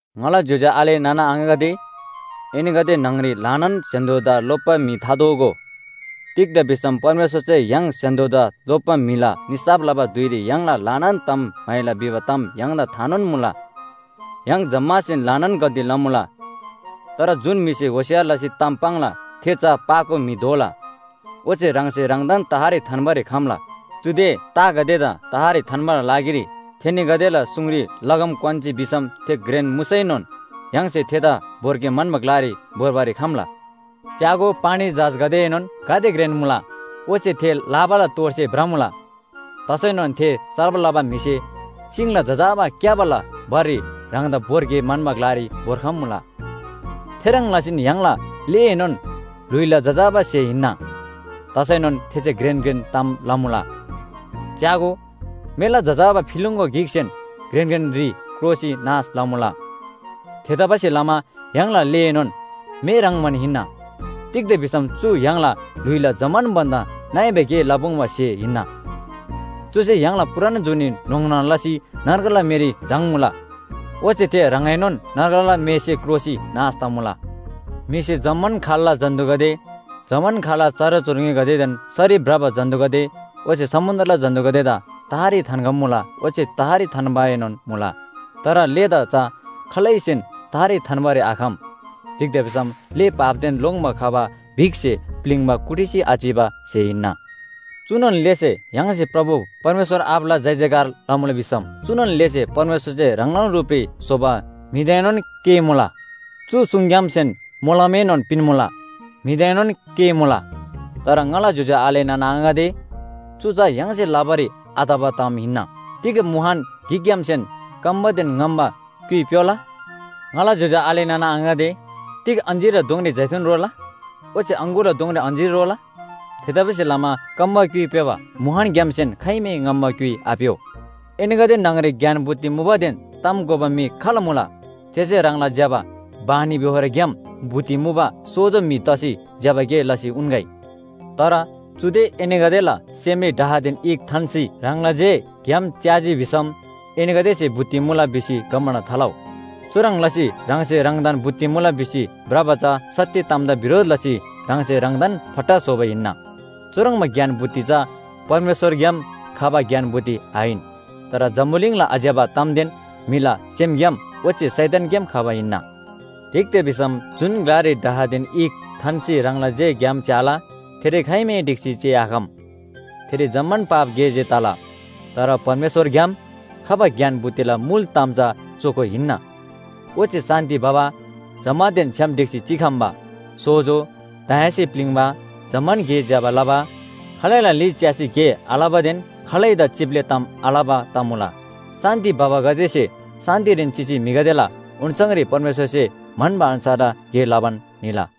ङाला ज्‍योज्‍यो आले नाना आङागदे, एनीगदे न्‍हङरी ल्‍हानान स्‍य्‍हान्‍दोदा लोप्‍बा म्‍हि थादोगो। तिग्‍दा भिसम परमेश्‍वरसे य्‍हाङ स्‍य्‍हान्‍दोदा लोप्‍बा म्‍हिला निसाफ लबा धुइरी य्‍हाङला ल्‍हानान ताम म्‍हाइला भिबा ताम य्‍हाङदा थानोन मुला। य्‍हाङ जम्‍मासेन ल्‍हानान गल्‍ती लमुला। तर जुन म्‍हिसे होशियार लसी ताम पाङ्ला थे चा पाको म्‍हि दोला। ओच्‍छे ह्राङसे ह्राङदान तहरी थान्‍बारी खम्‍ला। चुदे तागदेदा तहरी थान्‍बाला लागिरी थेनीगदेला सुङरी लगाम क्‍वान्‍जी भिसम थे घ्रेन मुसैनोन य्‍हाङसे थेदा भोर्गे म्‍हन्‍बा ग्‍लारी भोर्बारी खम्‍ला। च्‍यागो, पानी जहाजगदेएनोन गाते घ्रेन मुला, ओच्‍छे थे लाबाला तोडसे भ्रमुला। तसैनोन थे चलब लबा म्‍हिसे सिङला जजाबा क्‍याबाला भररी ह्राङदा भोर्गे म्‍हन्‍बा ग्‍लारी भोर्खम्‍मुला। थेह्रङ् लसीन य्‍हाङला लेएनोन ल्‍हुइला जजाबा स्‍हे हिन्‍ना, तसैनोन थेसे घ्रेन घ्रेन ताम लमुला। च्‍यागो, मेला जजाबा फिलिङ‍गो गिकसेन घ्रेन घ्रेन ह्रि क्रोसी नाश लमुला। थेतबासेलमा य्‍हाङला लेएनोन मे ह्रङ्‌बान हिन्‍ना। तिग्‍दा भिसम चु य्‍हाङला ल्‍हुइला जम्‍मान भन्‍दा नइबा गे लपुङ्बा स्‍हे हिन्‍ना। चुसे य्‍हाङला पूरान जुनी न्‍होङ्ना लसी नर्गला मेरी झाङ्मुला। ओच्‍छे थे ह्राङएनोन नर्गला मेसे क्रोसी नाश तमुला। म्‍हिसे जम्‍मान खाल्‍ला जन्‍तुगदे, जम्‍मान खाल्‍ला चराचुरुङ्‍गीदेन सरी भ्रबा जन्‍तुगदे ओच्‍छे समुन्‍द्रला जन्‍तुगदेदा तहरी थान्‍खम्‍मुला ओच्‍छे तहरी थान्‍बाएनोन मुला। तर लेदा चा खालैसेन तहरी थान्‍बारी आखम। तिग्‍दा भिसम ले पापदेन लोङ्‌बा खबा बिखसे प्‍लिङ्बा कुटिसी आचिबा स्‍हे हिन्‍ना। चुनोन लेसे य्‍हाङसे प्रभु परमेश्‍वर आबाला जयजयकार लमुला भिसम चुनोन लेसे परमेश्‍वरसे ह्राङलान रुपरी स्‍होबा म्‍हिदाएनोन केःमुला। चु सुङग्‍यामसेन मोलमएनोन पिन्‍मुला, म्‍हिदाएनोन केःमुला। तर ङाला ज्‍योज्‍यो आले नाना आङागदे, चु चा य्‍हाङसे लबारी आतबा ताम हिन्‍ना। तिग मुहान गिकग्‍यामसेन कम्‍बादेन ङम्‍बा क्‍युइ प्‍योला? ङाला ज्‍योज्‍यो आले नाना आङागदे, तिग अञ्‍जीरला दोङरी जैतून रोला? ओच्‍छे अङगुरला दोङरी अञ्‍जीर रोला? थेतबासेलमा कम्‍बा क्‍युइ प्‍योबा मुहानग्‍यामसेन खाइमै ङम्‍बा क्‍युइ आप्‍यो। एनीगदे न्‍हङरी ज्ञान बुद्धि मुबादेन ताम घोबा म्‍हि खाल मुला? थेसे ह्राङला ज्‍यबा बानीबेहोरग्‍याम बुद्धि मुबा सोजो म्‍हि तसी ज्‍यबा गे लसी उन्‍गै। तर चुदे एनीगदेला सेमरी डाहदेन ईख थान्‍सी ह्राङला जे ग्‍याम च्‍याजी भिसम एनीगदेसे बुद्धि मुला भिसी घमण्‍ड थालउ। चुह्रङ् लसी ह्राङसे ह्राङदान बुद्धि मुला भिसी भ्रबा चा सत्‍य तामदा बिरोध लसी ह्राङसे ह्राङदान फट्टा स्‍होबा हिन्‍ना। चुह्रङ्बा ज्ञान बुद्धि चा परमेश्‍वरग्‍याम खबा ज्ञान बुद्धि आहिन। तर जम्‍बुलिङला आज्‍यबा तामदेन म्‍हिला सेमग्‍याम ओच्‍छे शैतानग्‍याम खबा हिन्‍ना। तिग्‍दा भिसम जुन ग्‍लारी डाहदेन ईख थान्‍सी ह्राङला जे ग्‍याम च्‍याला, थेरी खाइमै ढिक्‍सी चिआखम। थेरी जम्‍मान पाप गे जे तला। तर परमेश्‍वरग्‍याम खबा ज्ञान बुद्धिला मुल ताम चा चोखो हिन्‍ना। ओच्‍छे शान्‍ति भबा, जम्‍मानदेन छ्‌याम ढिक्‍सी चिखम्‍बा, सोजो, दयासे प्‍लिङ्बा, जम्‍मान गे ज्‍यबा लबा, खालैला ली च्‍यासी गे आलबादेन खालैदा चिप्‍ले ताम आलबा तमुला। शान्‍ति भबागदेसे शान्‍तिरीन चिसी म्‍हिगदेला ओन्‍छाङरी परमेश्‍वरसे म्‍हन्‍बा अन्‍छारला गे लबान निला।